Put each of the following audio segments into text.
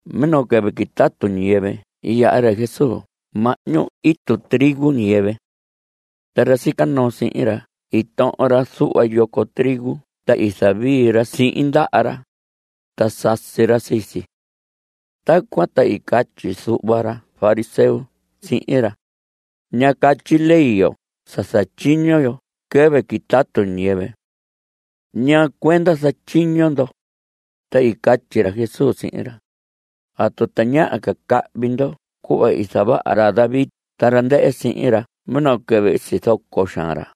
Minoo quɨvɨ quitatu ñiyɨvɨ i yaha ra Jesús mahñu itu trigo ñiyɨvɨ. Ta ra sica noo sihin ra i tohon ra zuhva yoco trigo ta i zavii ra sihin ndaha ra, ta sasi ra sii si. Tacuan ta i catyi zuhva ra fariseo sihin ra: Ña catyi ley yo sa zatyiño yo quɨvɨ quitatu ñiyɨvɨ. ¿Ñaa cuenda zatyiño ndo? Ta i catyi ra Jesús sihin ra: ¿Atu tañaha ca cahvi ndo cuhva i zavaha ra David ta ra ndɨhɨ sihin ra minoo quɨvɨ i sizoco xaan ra?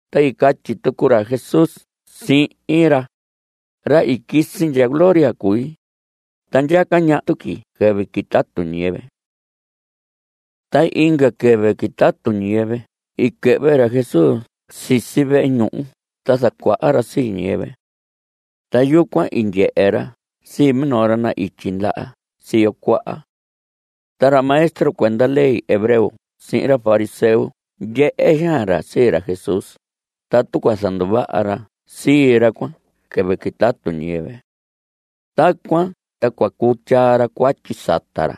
Ta i catyi tucu ra Jesús sihin ra: Ra i quisi ndya gloria cui, ta ndyaca ñaha tuqui quɨvɨ quitatu ñiyɨvɨ. Ta inga quɨvɨ quitatu ñiyɨvɨ i quɨhvɨ ra Jesús sisi vehe ñuhu ta zacuaha ra sii ñiyɨvɨ. Ta yucuan i ndyehe ra sii minoo ra na‑ityi ndaha siyo cuaha. Ta ra maestro cuenda ley hebreo sihin ra fariseo i ndyehe xaan ra sii ra Jesús tatu cua zanduvaha ra sii ra cuan quɨvɨ quitatu ñiyɨvɨ. Tacuan ta cua cuu tyaa ra cuatyi sata ra.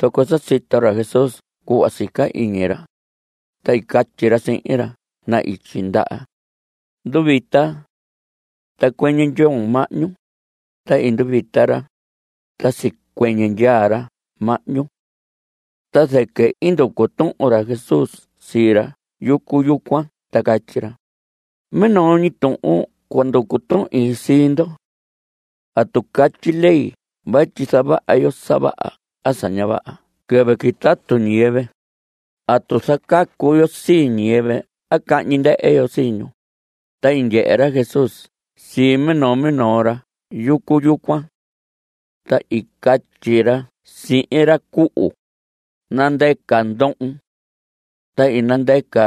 Zoco sa sito ra Jesús cuhva sica iñi ra, ta i catyi ra sihin ra na‑ityi ndaha: Nduvita. Ta cuɨñɨ ndyoon mahñu. Ta i nduvita ra, ta sicuɨñɨ ndyaa ra mahñu. Ta zɨquɨ i nducu tuhun ra Jesús sii ra yucu yucuan ta catyi ra: Minoo ñi tuhun cua nducu tuhin sii ndo. ¿Atu catyi ley vatyi zavaha yo sa vaha a sa ña vaha quɨvɨ quitatu ñiyɨvɨ? ¿Atu zacacu yo sii ñiyɨvɨ a cahñi ndɨhɨ yo sii ñu? Ta i ndyehe ra Jesús sii minoo minoo ra yucu yucuan. Ta i catyi ra sihin ra cuhu: Nandɨca ndohon. Ta i nandɨca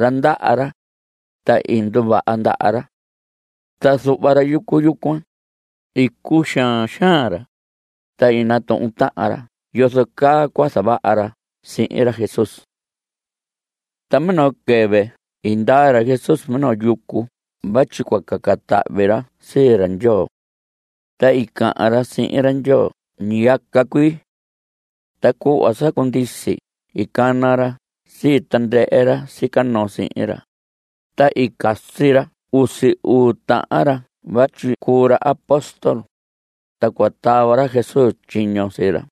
ra ndaha ra, ta i nduvaha ndaha ra. Ta zuhva ra yucu yucuan, i cuxaan xaan ra, ta i natuhun tahan ra yozo caa cua zavaha ra sihin ra Jesús. Ta minoo quɨvɨ i ndaa ra Jesús minoo yucu vatyi cua caca tahvi ra sii ra Ndyoo. Ta i cahan ra sihin ra Ndyoo ñiyaca cuii. Ta cuhva sa cundisi i cana ra sii tandɨhɨ ra sica noo sihin ra, ta i casi ra usi uu tahan ra vatyi cuu ra apóstol, ta cua tava ra Jesús tyiño sii ra.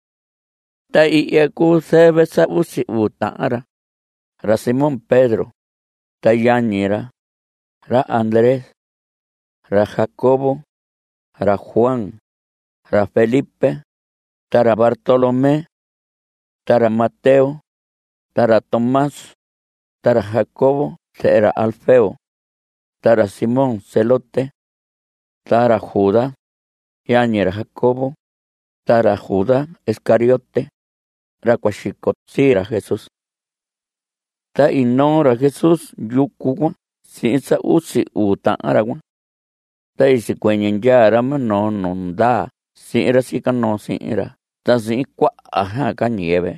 Ta ihya cuu zɨvɨ sa usi uu tahan ra: Ra Simón Pedro, ta yañi ra, ra Andrés. Ra Jacobo, ra Juan, ra Felipe, ta ra Bartolomé. Ta ra Mateo, ta ra Tomás, ta ra Jacobo zehe ra Alfeo ta ra Simón Zelote. Ta ra Judas, yañi ra Jacobo, ta ra Judas Iscariote, ra cua xico sii ra Jesús. Ta i noo ra Jesús yucu cuan sihin sa usi uu tahan ra cuan. Ta i sicuɨñɨ ndyaa ra minoo nu ndaa sihin ra sica noo sihin ra ta sihin cuaha ca ñiyɨvɨ,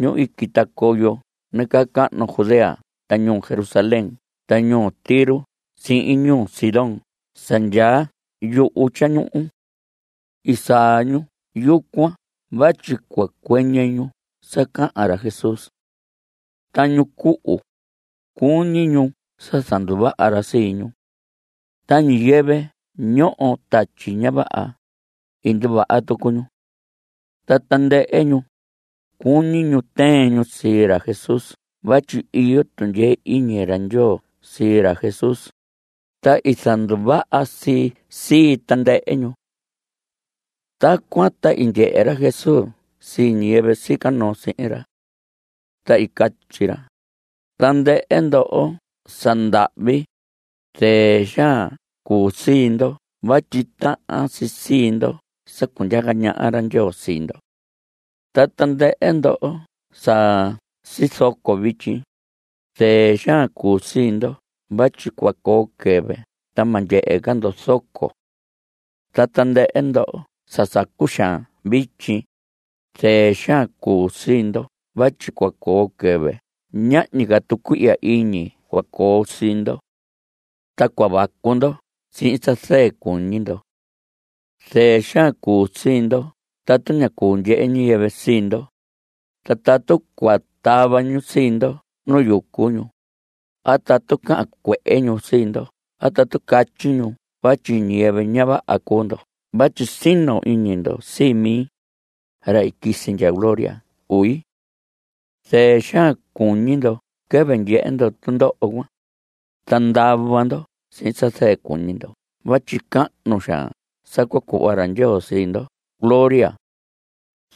ñu i quita coyo nacahnu Judea ta ñuu Jerusalén ta ñuu Tiro sihin ñuu Sidón sa ndyaa yuhu tyañuhu. I saa ñu yucuan vatyi cua cuɨñɨ ñu sa cahan ra Jesús. Ta ñu cuhu, cuñi ñu sa zanduvaha ra sii ñu. Ta ñiyɨvɨ ñoho tatyi ña vaha, i nduvaha tucu ñu. Ta tandɨhɨ ñu, cuñi ñu tɨɨn ñu sii ra Jesús vatyi iyo tundyee iñi ra Ndyoo sii ra Jesús, ta i zanduvaha si sii tandɨhɨ ñu. Tacuan ta i ndyehe ra Jesús sii ñiyɨvɨ sica noo sihin ra. Ta i catyi ra: Tandɨhɨ ndoho sa ndahvi, zɨɨ xaan cuu sii ndo vatyi tahan si sii ndo sa cundyaca ñaha ra Ndyoo sii ndo. Ta tandɨhɨ ndoho sa sizoco vityi, zɨɨ xaan cuu sii ndo vatyi cua coo quɨvɨ ta ma ndyehe ca ndo zoco. Ta tandɨhɨ ndoho sa sacu xaan vityi, zɨɨ xaan cuu sii ndo vatyi cua coo quɨvɨ ñahñi ca tucuihya iñi cua coo sii ndo. Ta cua vacu ndo sihin sa zɨɨ cuñi ndo. Zɨɨ xaan cuu sii ndo tatu ña cuu ndyehe ñiyɨvɨ sii ndo, ta tatu cua tava ñu sii ndo nu yucu ñu, a tatu cahan cuehe ñu sii ndo a tatu catyi ñu vatyi ñiyɨvɨ ña vaha cuu ndo vatyi sino iñi ndo sii mi, ra i quisi ndya gloria cui. Zɨɨ xaan cuñi ndo quɨvɨ ndyehe ndo tundoho cuan, ta ndava ndo sihin sa zɨɨ cuñi ndo vatyi cahnu xaan sa cua cuhva ra Ndyoo sii ndo gloria.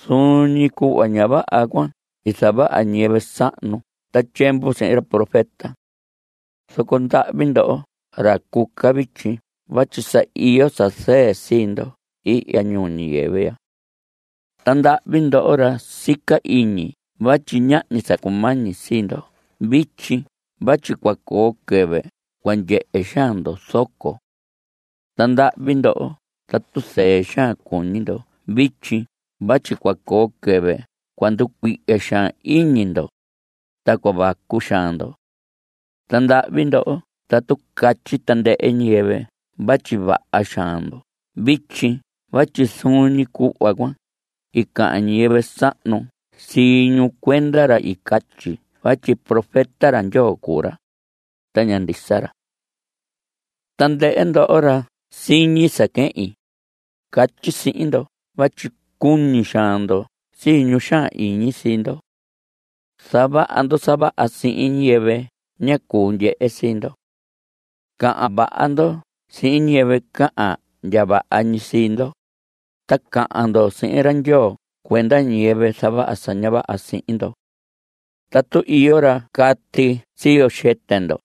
Zuun ñi cuhva ña vaha cuan i zavaha ñiyɨvɨ sahnu ta tyiemvu sihin ra profeta. Zoco ndahvi ndoho ra cuca vityi vatyi sa iyo sa zɨɨ sii ndo ihya ñuu ñiyɨvɨ ya. Ta ndahvi ndoho ra sica iñi vatyi ñahñi sa cumañi sii ndo vityi vatyi cua coo quɨvɨ cua ndyehe xaan ndo zoco. Ta ndahvi ndoho tatu zɨɨ xaan cuñi ndo vityi vatyi cua coo quɨvɨ cua nducuihya xaan iñi ndo, ta cua vacu xaan ndo. Ta ndahvi ndoho tatu catyi tandɨhɨ ñiyɨvɨ vatyi vaha xaan ndo vityi vatyi zuun ñi cuhva cuan i cahan ñiyɨvɨ sahnu sii ñu cuenda ra i catyi vatyi profeta ra Ndyoo cuu ra, ta ña ndisa ra. Tandɨhɨ ndoho ra siñi sa quehin, catyi sihin ndo vatyi cuñi xaan ndo sii ñu xaan iñi sii ndo. Zavaha ndo sa vaha sihin ñiyɨvɨ ña cuu ndyehe sii ndo. Cahan vaha ndo sihin ñiyɨvɨ cahan ndya vaha ñi sii ndo, ta cahan ndo sihin ra Ndyoo cuenda ñiyɨvɨ zavaha sa ña vaha sihin ndo. Tatu iyo ra cati ii siyo xɨtɨ ndo,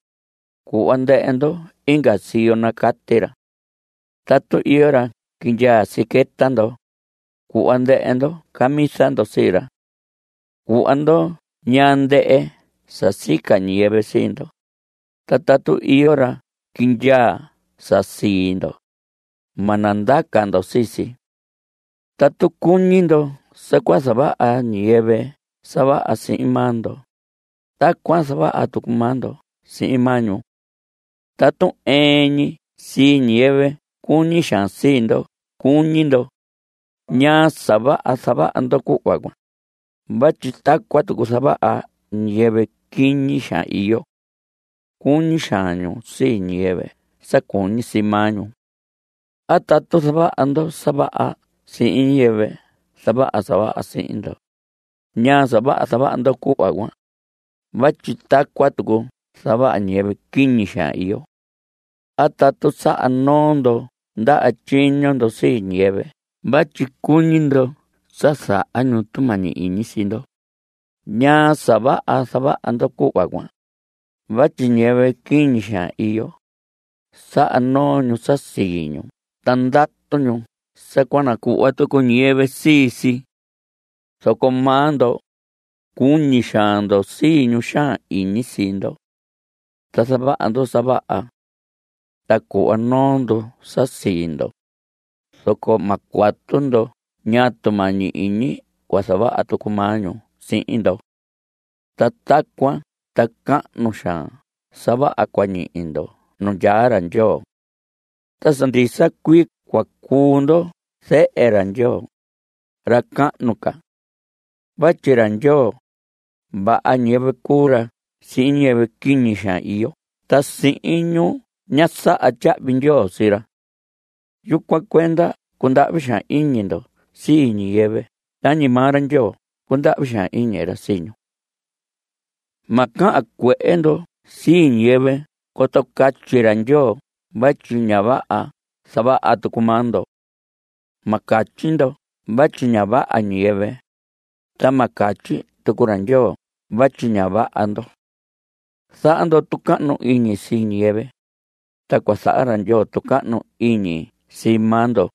cuhva ndɨhɨ ndo inga siyo nacati ra. Tatu iyo ra quindyaa siqueta ndo, cuhva ndɨhɨ ndo camisa ndo sii ra. Cuhva ndo ñaa ndɨhɨ sa sica ñiyɨvɨ sii ndo, ta tatu iyo ra quindyaa sa sii ndo, ma nandaca ndo sii si. Tatu cuñi ndo sa cua zavaha ñiyɨvɨ sa vaha sihin maa ndo, tacuan zavaha tucu maa ndo sihin maa ñu. Tatu ɨɨn ñi sii ñiyɨvɨ cuñi xaan sii ndo cuñi ndo, ¿ñaa sa vaha zavaha ndo cuhva cuan? vatyi tacuan tucu zavaha ñiyɨvɨ quiñi xaan iyo. Cuñi xaan ñu sii ñiyɨvɨ sa cuñi sii maa ñu. A tatu zavaha ndo sa vaha sihin ñiyɨvɨ zavaha sa vaha sihin ndo, ¿ñaa sa vaha zavaha ndo cuhva cuan? vatyi tacuan tucu zavaha ñiyɨvɨ quiñi xaan iyo. A tatu saha noo ndo ndaha tyiño ndo sii ñiyɨvɨ vatyi cuñi ndo sa zaha ñu tumañi iñi sii ndo, ¿ñaa sa vaha zavaha ndo cuhva cuan? vatyi ñiyɨvɨ quiñi xaan iyo, saha noo ñu sa sii ñu ta ndatu ñu sa cua nacuhva tucu ñiyɨvɨ sii si. Zoco maa ndo, cuñi xaan ndo sii ñu xaan iñi sii ndo. Ta zavaha ndo sa vaha. Ta cuhva noo ndo sa sii ndo, zoco ma cuatu ndo ñaa tumañi iñi cua zavaha tucu maa ñu sii ndo. Ta tacuan ta cahnu xaan sa vaha cua ñihi ndo nu ndyaa ra Ndyoo. Ta sa ndisa cuii cua cuu ndo zehe ra Ndyoo, ra cahnu ca. Vatyi ra Ndyoo, vaha ñiyɨvɨ cuu ra sihin ñiyɨvɨ quiñi xaan iyo ta sihin ñu ña saha tyahvi ndyoo sii ra. Yucuan cuenda cundahvi xaan iñi ndo sii ñiyɨvɨ tañi maa ra Ndyoo cundahvi xaan iñi ra sii ñu. Ma cahan cuehe ndo sii ñiyɨvɨ coto catyi ra Ndyoo vatyi ña vaha zavaha tucu maa ndo. Ma catyi ndo vatyi ña vaha ñiyɨvɨ, ta ma catyi tucu ra Ndyoo vatyi ña vaha ndo. Zaha ndo tucahnu iñi sii ñiyɨvɨ, ta cua zaha ra Ndyoo tucahnu iñi sii maa ndo.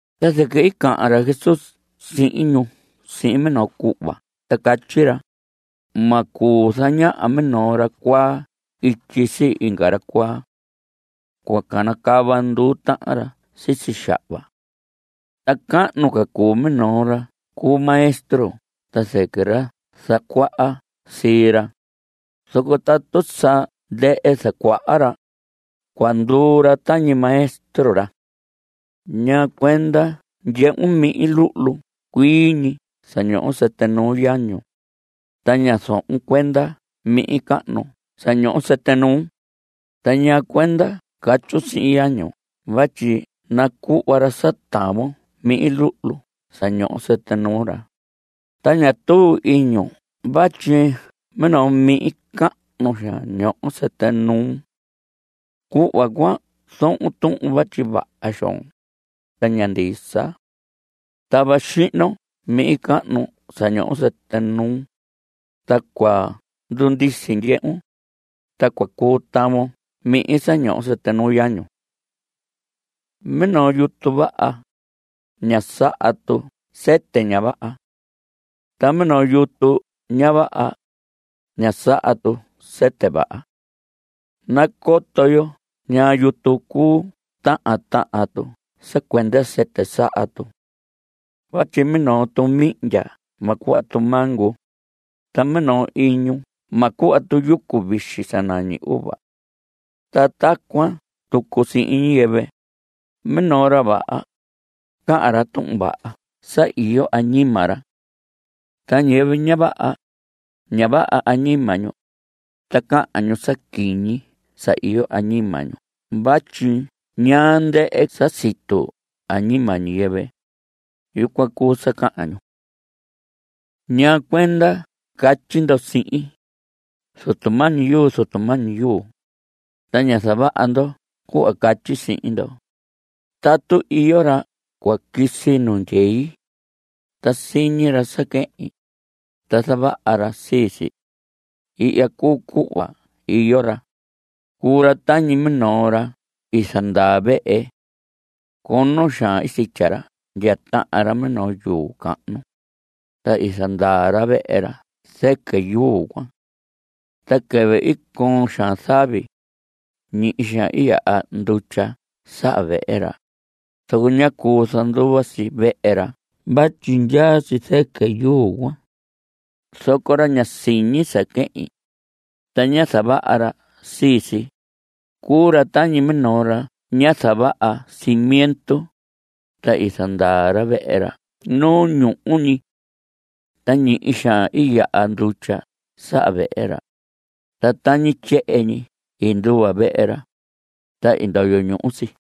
Ta zɨquɨ i cahan ra Jesús sihin ñu sihin minoo cuhva ta catyi ra: Ma cuu zañaha minoo ra cuaa ityi sii inga ra cuaa. Cua canacava nduu tahan ra sisi xahva. Ta cahnu ca cuu minoo ra cu maestro ta zɨquɨ ra zacuaha sihin ra, zoco tatu sa ndɨhɨ zacuaha ra, cua nduu ra tañi maestro ra. ¿Ñaa cuenda ndyehun mihin luhlu cuii ñi sa ñoho sɨtɨ nuu yañun, ta ña zohon cuenda mihin cahnu sa ñoho sɨtɨ nuun? Ta ¿ñaa cuenda catyun sihin yañun vatyi nacuhva ra sa tavon mihin luhlu sa ñoho sɨtɨ nuu ra? ta ña tuu iñun vatyi minoo mihin cahnu xaan ñoho sɨtɨ nuun. Cuhva cuan zohon tuhun vatyi vaha xoon, ta ña ndisa. Tava xihnon mihin cahnu sa ñoho sɨtɨ nuun, ta cua ndundisi ndyehun, ta cua cuu tavon mihin sa ñoho sɨtɨ nuu yañun. Minoo yutu vaha, ña saha tu sɨtɨ ña vaha. Ta minoo yutu ña vaha, ña saha tu sɨtɨ vaha. Nacoto yo ñaa yutu cuu tahan tahan tu sa cuenda sɨtɨ saha tu. Vatyi minoo tu mihndya ma cuhva tu mango, ta minoo iñu ma cuhva tu yucu vixi sa nañi uva. Ta tacuan tucu sihin ñiyɨvɨ. Minoo ra vaha, cahan ra tuhun vaha sa iyo añima ra. Ta ñiyɨvɨ ña vaha, ña vaha añima ñu, ta cahan ñu sa quiñi sa iyo añima ñu vatyi ñaa ndɨhɨ sa situ añima ñiyɨvɨ, yucuan cuu sa cahan ñu. ¿Ñaa cuenda catyi ndo sihin: “Zutu mañi yuu, Zutu mañi yuu”, ta ña zavaha ndo cuhva catyi sihin ndo? Tatu iyo ra cua quisi nu ndyei, ta siñi ra sa quehin, ta zavaha ra sii si, ihya cuu cuhva iyo ra: Cuu ra tañi minoo ra i zandaa vehe. Cono xaan sitya ra ndya tahan ra minoo yuu cahnu, ta i zandaa ra vehe ra zɨquɨ yuu cuan. Ta quɨvɨ i coon xaan zavi, ñihi xaan i yaha ndutya saha vehe ra, zoco ñá cuu zanduva si vehe ra vatyi ndyaa si zɨquɨ yuu cuan. Zoco ra ña siñi sa quehin, ta ña zavaha ra sii si, cuu ra tañi minoo ra ñá zavaha cimiento, ta i zandaa ra vehe ra nu ñuhu ñi. Ta ñihi xaan i yaha ndutya saha vehe ra, ta tañi tyehen ñi i nduva vehe ra, ta i ndoyo ñuhu si.